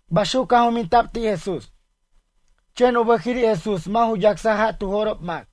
Baxuc caj juminta'b ti' Jesús. Chen u bʌjiri' Jesús mʌ' ju yacsaj ja' tu jo'rob mac.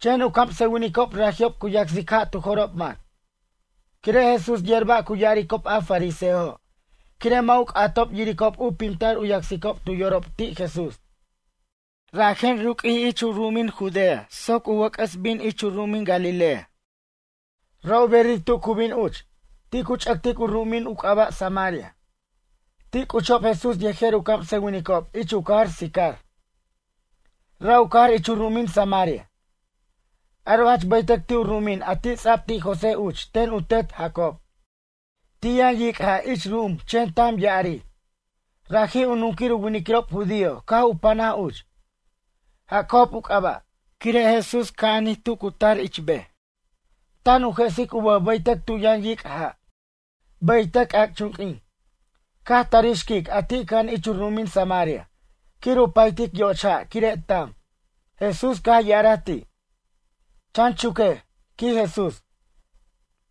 Chen u camsʌwinicob raji'ob cu yacsic ja' tu jo'rob mac. Quire' Jesús yer ba' cu ya'aricob a fariseojo' quire' mʌ' u c'atob yiricob u pimtar u yacsicob tu yorob ti' Jesús. Rajen ruq'uij ich u ru'umin Judea soc u wʌc'ʌs bin ich u ru'umin Galilea. Ra' u berir tu cu bin uch, ti' cu ch'ʌctic u ru'umin u c'aba' Samaria. Ti' c'uchob Jesús yejer u camsʌwinicob ich u cajar Sicar. Ra' u cajar ich u ru'umin Samaria. Aro' jach bʌytʌc ti' u ru'umin a ti' ts'ab ti' José uch ten u tet Jacob. Ti' yʌn yic' ja' ich ru'um chen tam yʌn ya'arir. Raji' u nunquir u winiquirob judío caj u panaj uch, Jacob u c'aba'. Quire' Jesús ca'anij tu cu tar ich bej. Tan u jesic u bʌj bʌytʌc tu yʌn yic' ja'. Bʌytʌc c'ac'chunq'uin. Caj tarij xquic a ti' cʌja'an ich u ru'umin Samaria. Quir u paytic yoch ja' quire' tam. Jesús caj ya'araj ti': ―Chan chuquej ―quij Jesús―,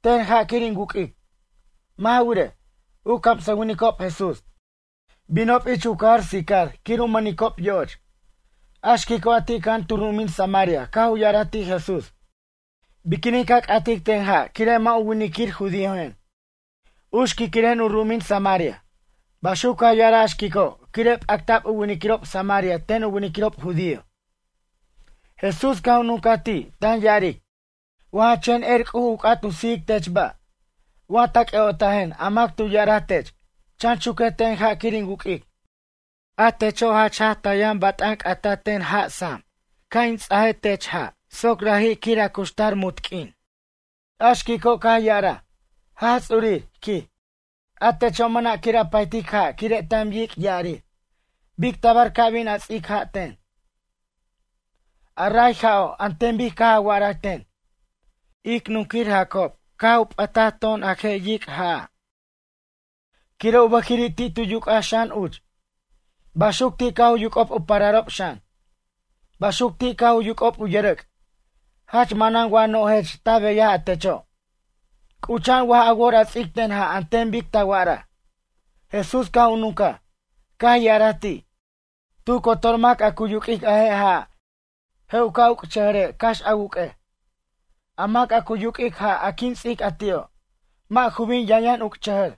ten ja' quir in wuq'uic. Mʌ' ja wirej, u camsʌwinicob Jesús, binob ich u cajar Sicar quir u mʌnicob yo'och. A xquico' a ti' cʌja'an tu ru'umin Samaria caj u ya'araj ti' Jesús: ―Biquinin ca c'atic ten ja' quire mʌ' u winiquir judíojen? U xquiquiren u ru'umin Samaria. Baxuc caj ya'araj a xquico' quire' p'acta'b u winiquirob samaria ten u winiquirob judío. Jesús caj u nuncaj ti', tan ya'aric: ―Wa ja chen er C'uj u c'at u sijic tech ba', wa ta c'ʌ'otajen a mac a tu ya'araj tech: “Chan chuquej ten ja' quir in wuq'uic”, a techo' jach jaj ta yʌn bat'an c'ata ten sam ja' ca' in ts'a tech ja' soc raji' quir a cuxtar munt q'uin. A xquico' caj ya'araj: ―Jaj Ts'urir ―quij―. A techo' mʌna' quir a paytic ja' quire' tam yic' ya'arir. Bic tabar ca bin a ts'ic ja' ten, a ray ja'o' an ten bic caj a wa'araj ten? Ic nunquir Jacob caj u p'ʌta to'on a je' yic' ja'a'. Quire' u bʌjiri' ti' tu yuc'aj xan uch. Baxuc ti' caj u yuc'ob u pararob xan, baxuc ti' caj u yuc'ob u yʌrʌc'. Jach manan wa no'jech ta beyaj a techo', c'ucha'an waj a wor a ts'ic ten ja' an ten bic ta wa'araj? Jesús caj u nuncaj, caj ya'araj ti': ―Tu cotor mac a cu yuq'uic a je' ja'a', je' u ca' uc'chʌjʌre' cax a wuq'uej. A mac a cu yuq'uic ja' a quin ts'ic a ti'o', mʌ' ju bin yʌnyʌn uc'chʌjʌr.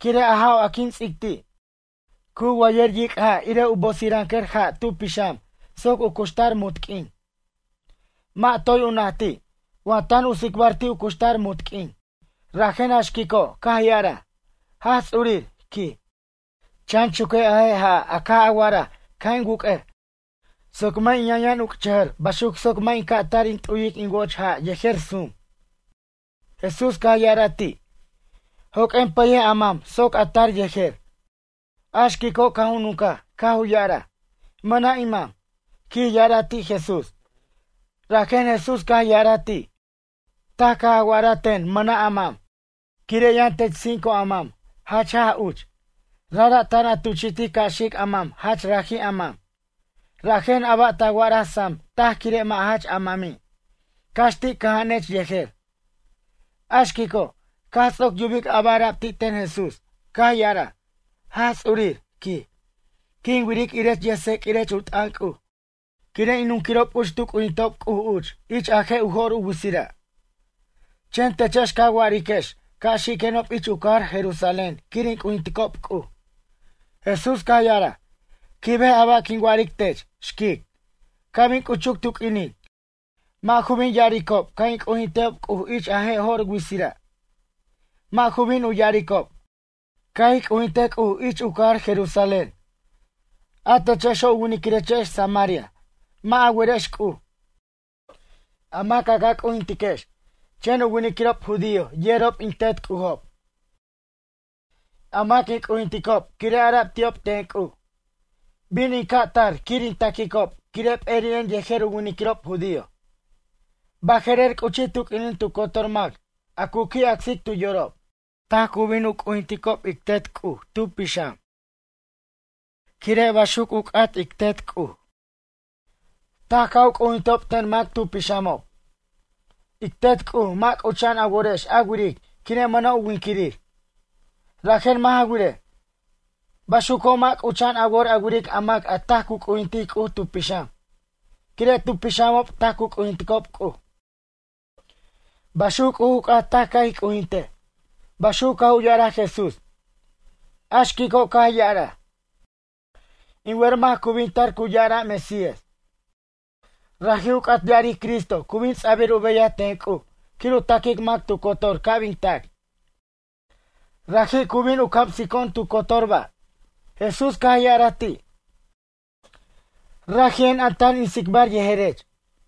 Quire' a ja'o' a quin ts'ic ti', cu wayʌr yic' ja' irej u bosirʌncʌr ja' tu pixam soc u cuxtar munt q'uin. Mʌ' toy u najti', wa tan u tsicbar ti' u cuxtar munt q'uin, rajen a xquico' caj ya'araj: ―Jaj Ts'urir ―quij―, chan chuquej a je' ja'a' a caj a wa'araj ca' in wuq'uej soc mʌ' in yʌnyʌn uc'chʌjʌr baxuc soc mʌ' in ca' tar in t'uyic in woch ja' yejer sum. Jesús caj ya'araj ti': ―Joq'uen pʌyej a mam soc a tar yejer. A xquico' caj u nuncaj caj u ya'araj: ―Mʌna' in mam ―quij ya'araj ti' Jesús. Rajen Jesús caj ya'araj ti': ―Taj caj a wa'araj ten mʌna' a mam quire' yʌn tech cinco a mam jach jaj uch. Rajra' tan a tuchi'tic ca' xic a mac jach raji' a mam. Rajen a ba' ta wa'araj sam taj quire' mʌ' jach a mami', cax ti' cʌja'anech yejer. A xquico', caj ts'oc yubic a ba' ara'b ti' ten Jesús, caj ya'araj: ―Jaj Ts'urir ―quij―, quin wiric irech yʌjtseq'uirech u t'ʌn C'uj. Quire' in nunquirob uch tu c'ujinticob C'uj uch ich a je' u jo'r u witsira'. Chen techex ca wa'ariquex ca' xiquenob ich u cajar Jerusalén quir in c'ujinticob C'uj. Jesús caj ya'araj: ―Quibej a ba' quin wa'aric tech, xquic. Ca' bin c'uchuc tu q'uinin, mʌ' ju bin ya'aricob ca' in c'ujintejob C'uj ich a je' jo'r witsira'. Mʌ' ju bin u ya'aricob: “Ca' ij c'ujintej C'uj ich u cajar Jerusalén.” A techexo' u winiquirechex samaria mʌ' a werex C'uj, a mac a ca c'ujintiquex. Chen u winiquirob judío yerob in Tet C'ujob, a mac in c'ujinticob quire' ara'b ti'ob ten C'uj: “Bin in ca' in tar quir in taquicob quire' p'eri'en yejer u winiquirob judío.” Baje'rer c'uchij tu q'uinin tu cotor mac a cu qui' acsic tu yorob, taj cu bin u c'ujinticob ic Tet C'uj tu pixam. Quire' baxuc u c'at ic Tet C'uj, taj ca' u c'ujintejob ten mac tu pixamob. Ic Tet C'uj mʌ' c'ucha'an a worex a wiric quire' mʌna' u winquirir. Rajen mʌ' ja wirej. Baxuco' mʌ' c'ucha'an a wor a wiric a mac a taj cu c'ujintic C'uj tu pixam. Quire' tu pixamob taj cu c'ujinticob C'uj. Baxuc C'uj u c'at taj ca' ij c'ujintej ―baxuc caj u ya'araj Jesús. A xquico' caj ya'araj: ―In wer mac cu bin tar cu ya'ara' Mesías ―raji' u c'at ya'aric Cristo cu bin ts'abir u beyaj ten C'uj quir u taquic mac tu cotor ca' bin tac―. Raji' cu bin u camsico'on tu cotor ba'. Jesús caj ya'araj ti': ―Raji'en a tan in tsicbar yejerech.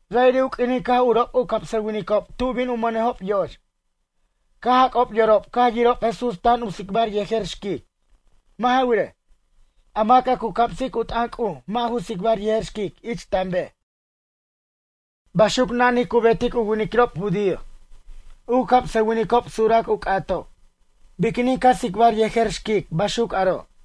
Ra'iri' u q'uinin caj urob u camsʌwinicob tu bin u mʌnejob yo'och. Caj jac'ob yorob caj yirob Jesús tan u tsicbar yejer xquic. Mʌ' ja wirej, a mac a cu camsic u t'ʌn C'uj mʌ' ju tsicbar yejer xquic ich tan bej, baxuc na'nij cu betic u winiquirob judío. U camsʌwinicob surac u c'atob: “Biquinin ca tsicbar yejer xquic baxuc aro'?”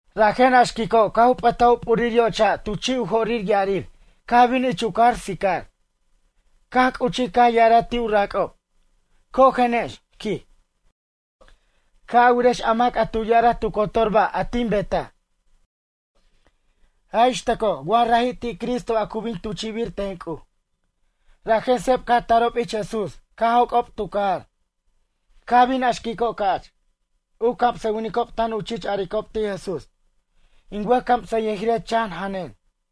Rajen a xquico' caj u p'ʌta u p'urir yoch ja' tu chi' u jorir ya'arir caj bin ich u cajar Sicar. Caj c'uchij caj ya'araj ti' u rac'ob: ―Cojenex ―quij―, ca' a wirex a mac a tu ya'araj tu cotor ba' a tin betaj. Jaj ix tʌco wa raji' ti' Cristo a cu bin tuchi'bir ten C'uj. Rajen seb caj tarob ich Jesús caj joc'ob tu cajar. Caj bin a xquico' ca'ch, u camsʌwinicob tan u chich a'aricob ti' Jesús: ―In wʌjcamsʌyʌjirech chan janen.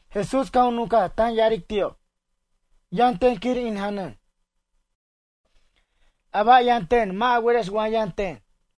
Jesús caj u nunca tan ya'aric ti'ob: ―Yʌn ten quir in janʌn. A ba' yʌn ten mʌ' a werex wa yʌn ten.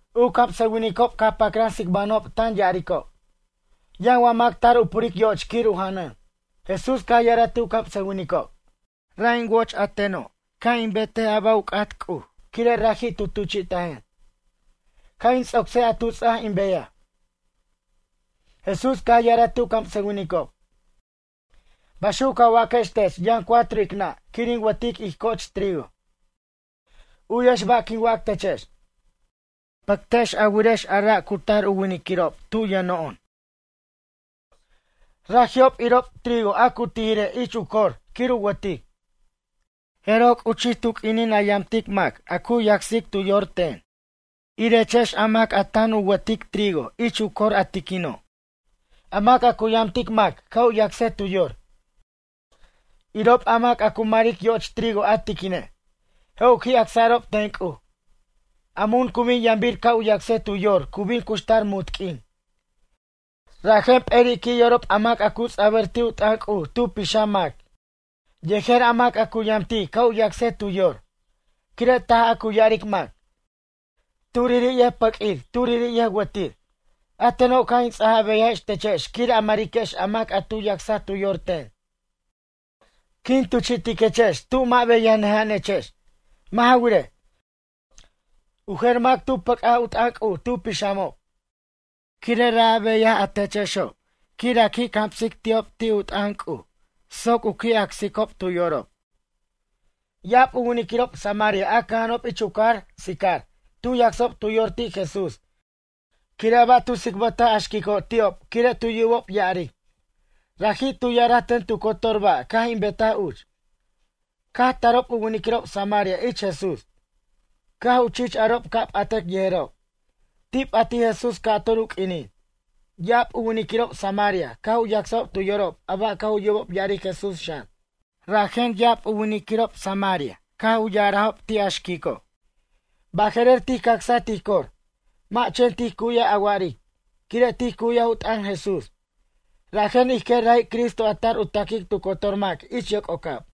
U camsʌwinicob caj pacran tsicbanʌjob tan ya'aricob: ―Yʌn wa mac tar u puric yo'och quir u janʌn? Jesús caj ya'araj ti' u camsʌwinicob: ―Ra' in woch a teno' ca' in betej a ba' u c'at C'uj quire' raji' tu tuchi'tajen. Ca' in ts'ocsej a tu ts'aj in beyaj. Jesús caj ya'araj ti' u camsʌwinicob: ―Baxuc ca waquex tech yʌn cuatro ic nʌ' quir ic wʌtic ij co'och trigo. U'yex ba' quin wac techex. Pʌctex a wirex a ra' cu tar winiquirob tub yʌno'on. Raji'ob irob trigo a cu tijire' ich cor quir u wʌtic. Jeroj c'uchij tu q'uinin a yamtic mac u yacsic tu yor ten. Irechex a mac tan a wʌtiquex trigo ich cor a tiquino'. A mac a cu yamtic mac ca' u yacsej tu yor, irob a mac a cu maric yoch trigo a tiquine'. Je' u qui' acsa'rob ten C'uj. A mun cu bin yambir ca' u yacsej tu yor cu bin cuxtar munt q'uin. Rajen p'eri' qui' yorob a mac a cu ts'abʌr ti' u t'ʌn C'uj tu pixam mac yejer a mac a cu yamtic ca' u yacsej tu yor. Quire' taj a cu ya'aric mac: “Turiri' yʌjpʌq'uir turiri' yʌjwʌtir.” A teno' caj in ts'aj a beyajex techex quir a mariquex a mac a tu yacsaj tu yor ten. Quin tuchi'tiquechex tub mʌ' beyajnʌja'anechex. Mʌ' ja wirej, u jer mac tu pʌc'aj u t'ʌn C'uj tu pixamob. Quire' ra' a beyaj a techexo' quir a qui' camsic ti'ob ti' u t'ʌn C'uj soc u qui' acsicob tu yorob. Ya'ab u winiquirob samaria a cʌja'anob ich u cajar Sicar tu yacsob tu yorob ti' Jesús quire' a ba' tu tsicbʌtaj a xquico' ti'ob quire' tu yubob ya'aric: “Raji' tu ya'araj ten tu cotor ba' caj in betaj uch.” Caj tarob u winiquirob samaria ich Jesús. Caj u chich arob ca' p'atʌc yejerob. Ti' p'atij Jesús ca'tur u q'uinin. Ya'ab u winiquirob samaria caj u yacsajob tu yorob a ba' caj u yubob ya'aric Jesús xan. Rajen ya'ab u winiquirob samaria caj u ya'arajob ti' a xquico': ―Baje'rer tij cacsaj tij cor, mʌ' chen tij cu'yaj a wa'aric. Quire' tij cu'yaj u t'ʌn Jesús, rajen ij quer raji' Cristo a tar u taquic tu cotor mac ich yoc'ocab.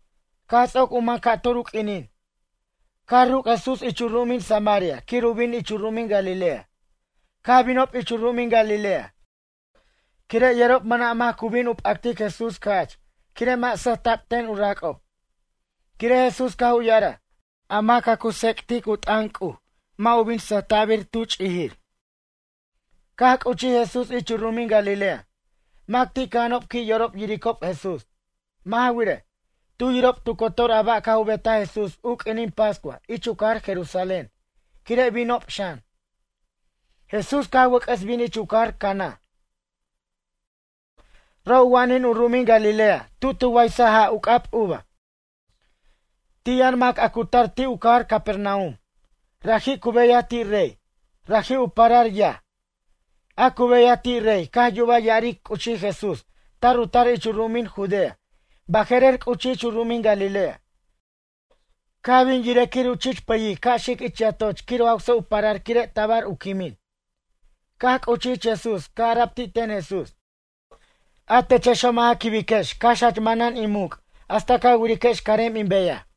Caj ts'oc u man ca'tur u q'uinin. Caj ruc' Jesús ich u ru'umin Samaria quir u bin ich u ru'umin Galilea. Caj binob ich u ru'umin Galilea quire' yerob mʌna' mac cu bin u p'actic Jesús ca'ch quire' mʌ' sʌjta'b ten u rac'ob. Quire' Jesús caj u ya'araj: “A mac a cu tsec'tic u t'ʌn C'uj mʌ' u bin sʌjta'bir tu ch'ijir.” Caj c'uchij Jesús ich u ru'umin Galilea, mac ti' cʌja'anob qui' yorob yiricob Jesús. Mʌ' ja wirej, tu yirob tu cotor a ba' caj u betaj Jesús u q'uinin pascua ich u cajar Jerusalén quire' binob xan. Jesús caj wʌc'ʌs bin ich u cajar Caná ra' u wa'an u ru'umin Galilea tu' tu waysaj ja' u c'ab uva. Ti' yʌn mac a cu tar ti' u cajar Capernaum. Raji' cu beyaj ti' rey. Raji' u parar yaj. A cu beyaj ti' rey caj yuba ya'aric c'uchij Jesús tar u tar ich u ru'umin Judea baje'rer c'uchij ich u ru'umin Galilea. Caj bin yirej quir u chich pʌyic ca' xic ich yatoch quir u jawsa' u parar quire' tabar u quimin. Caj c'uchij ich Jesús caj ara'b ti' ten Jesús: ―A techexo' mʌ' ja quibiquex cax jach manan in muc' hasta ca wiriquex carem in beyaj.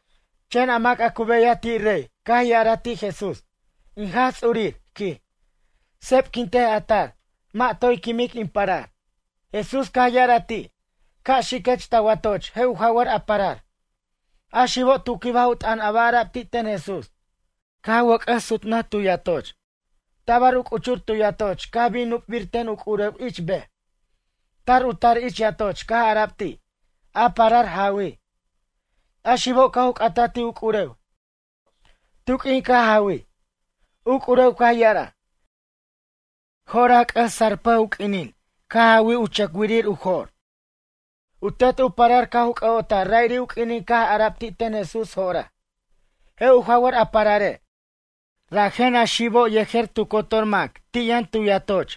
Chen a mac a cu beyaj ti' rey caj ya'araj ti' Jesús: ―In Jaj Ts'urir ―quij―, sepquintej a tar, mʌ' toy quimic in parar. Jesús caj ya'araj ti': ―Ca' xiquech ta watoch je' u jawʌr a parar. A xibo' tu quibaj u t'ʌn a ba' ara'b ti' ten Jesús. Caj wʌc'ʌs sutnʌj tu yatoch Tabar u c'uchur tu yatoch caj bin nupbir ten u c'urew ich bej. Tar u tar ich yatoch caj ara'b ti': ―A parar jawij. A xibo' caj u c'ataj ti' u c'urew: ―Tu' q'uin caj jawij? U c'urew caj ya'araj: ―Jo'raj c'ʌs sarpʌj u q'uinin caj jawij u chʌcwirir u jo'r. U tet u parar caj u c'ʌ'otaj ra'iri' u q'uinin caj ara'b ti' ten Jesús jo'raj: “Je' u jawʌr a parare'”; rajen a xibo' yejer tu cotor mac ti' yʌn tu yatoch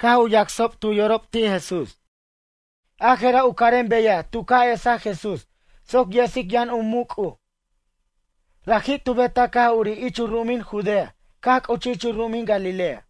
caj u yacsob tu yorob ti' Jesús. A jera' u carem beyaj tu ca' esaj Jesús soc yesic yʌn u muc' C'uj. Raji' tu betaj caj urij ich u ru'umin Judea caj c'uchij ich u ru'umin Galilea.